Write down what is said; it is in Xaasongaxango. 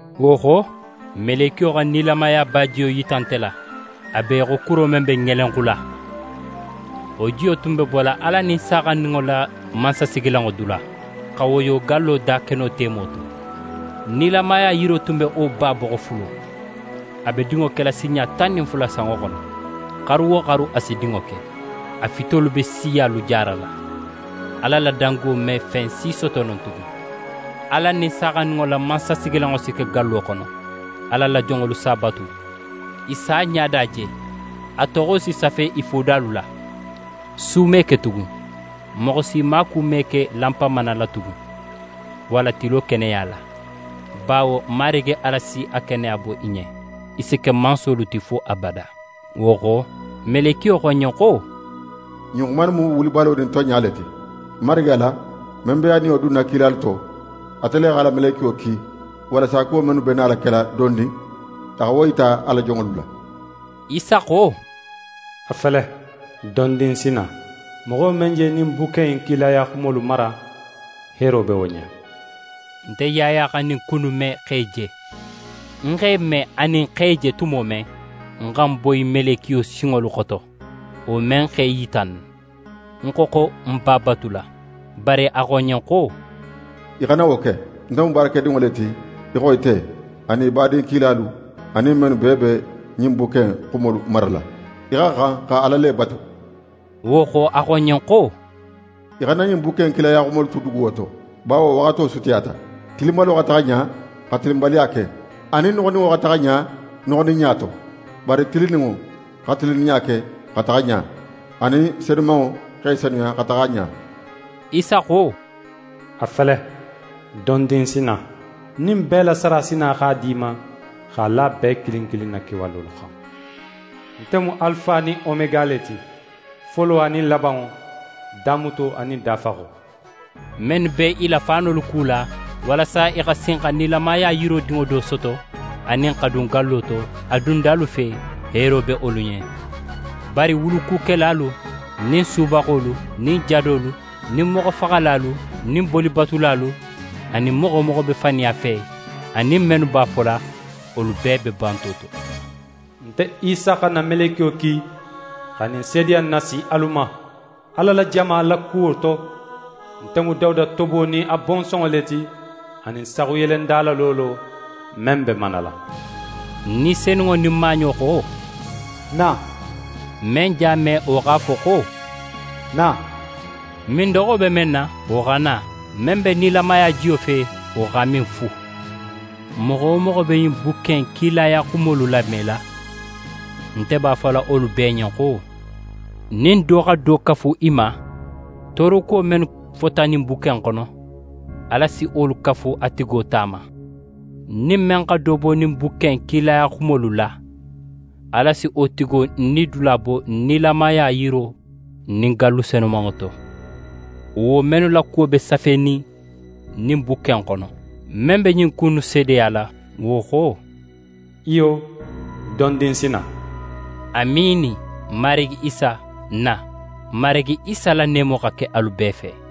Wo xo, melekiyo xa nilamaya bajiyo yita nte la, a be í xo kuro men be ŋelenxula. Wo jiyo tun be bola Ala nin Saaxandinŋo la mansasigilanŋo dula, xa woyo gallo dakeno temo to. Nilamaya yiro tun be wo ba boxo fulo. A be dinŋo kela sinɲa tan nin fula sanŋo xono. Xaru wo xaru a si dinŋo ke. A fitolu be siyalu jaarala. Ala la dango me fen si soto non tugun. Ala nin Saaxandinŋo la mansasigilanŋo si ke gallo xono, Ala la jonŋolu s'a batu. I si a ɲada je. A toxo si safe i fodalu la. Su me ke tugun. Moxo si maaku me ke lanpamana la tugun, walla tilo keneya la, bawo Marigi Ala si a keneya bo i ɲen. I si ke mansolu ti fo abada. Wo xo, melekiyo xo ń ɲen xo: «Ɲin xuma innu mu wulibalo nin tonɲa le ti. Marigi Ala, men be a Niyo dunna kilalu to, ate le x'a la melekiyo ki, walasa kuwo men be nala kela dondin, a xa wo yita a la jonŋolu la.» Isa xo: «A fele, dondin ń si na! Moxo men je ɲin bukke in kilaya xumolu mara, heero be wo ɲen!» Nte Yaya xa ɲin ku innu me, x'e je. Ń x'e me anin x'e je tumo men, ń xa ń boyi melekiyo sinŋolu xoto, wo men x'é yita ń na. Ń xo, xo ń b'a batula. Bari a xo ń ɲen xo: «Í xana wo ke! Nte mu baarakedinŋo le ti í xo ite, anin í badin kilalu, anin mennu bee be ɲin bukke in xumolu marala. Í xa xan xa Ala le batu.» Wo xo, a xo ń ɲen xo: «Í xana ɲin bukke in kilaya xumolu tu duguwo to, bawo waxato sutiyata. Tilinbalo xa taxa ɲa xa tilinbaliya ke, anin noxoninŋo xa taxa ɲa noxoninɲa to. Bari tilinninŋo xa tilinninɲa ke xa taxa ɲa, anin senumanŋo x'é senuya xa taxa ɲa.» Isa xo: «A fele, dondin ń si na! Ń nin bee la sara si na x'a di í ma, x'a la bee kilin kilin na kewalolu xan. Nte mu Alifa nin Omega le ti, folo anin labanŋo, damuto anin dafaxo.» Mennu be i la faanolu kula, walasa i xa sin xa nilamaya yiro dinŋo do soto, anin xa dun gallo to, a dundalu fe, heero be wolu ɲen. Bari wulukukelalu nin subaxolu nin jadolu, nin moxofaxalalu, nin bolibatulalu, anin moxo wo moxo be faniya fe, anin mennu b'a fola, wolu bee be banto to! «Nte Isa xa ń na melekiyo ki xa ɲin seedeya in nasi alu ma, Ala la jamalu la kuwo to. Nte mu Dawuda tobo nin a bonsonŋo le ti, anin saxuyelenda la loolo, men be manala.» Ni Senunŋo nin maaɲo xo: «Na!» Men je a me wo x'a fo xo: «Na!» Mindoxo be men na, wo xa na; men be nilamaya jiyo fe, wo x'a min fu. Moxo wo moxo be ɲin bukke in kilaya xumolu lamela, nte b'a fola wolu bee ɲen xo: Nin do xa do kafu i ma, toorokuwo mennu fota ɲin bukke in xono, Ala si wolu kafu a tigo ta ma. Nin men xa do bo ɲin bukke in kilaya xumolu la, Ala si wo tigo nidula bo nilamaya yiro nin gallu senumanŋo to, wo mennu la kuwo be safenin ɲin bukke in xono. Men be ɲin ku innu seedeyala, wo xo: «Iyo, dondin ń si na!» Amiini! Marigi Isa, na! Marigi Isa la neemo xa ke alu bee fe.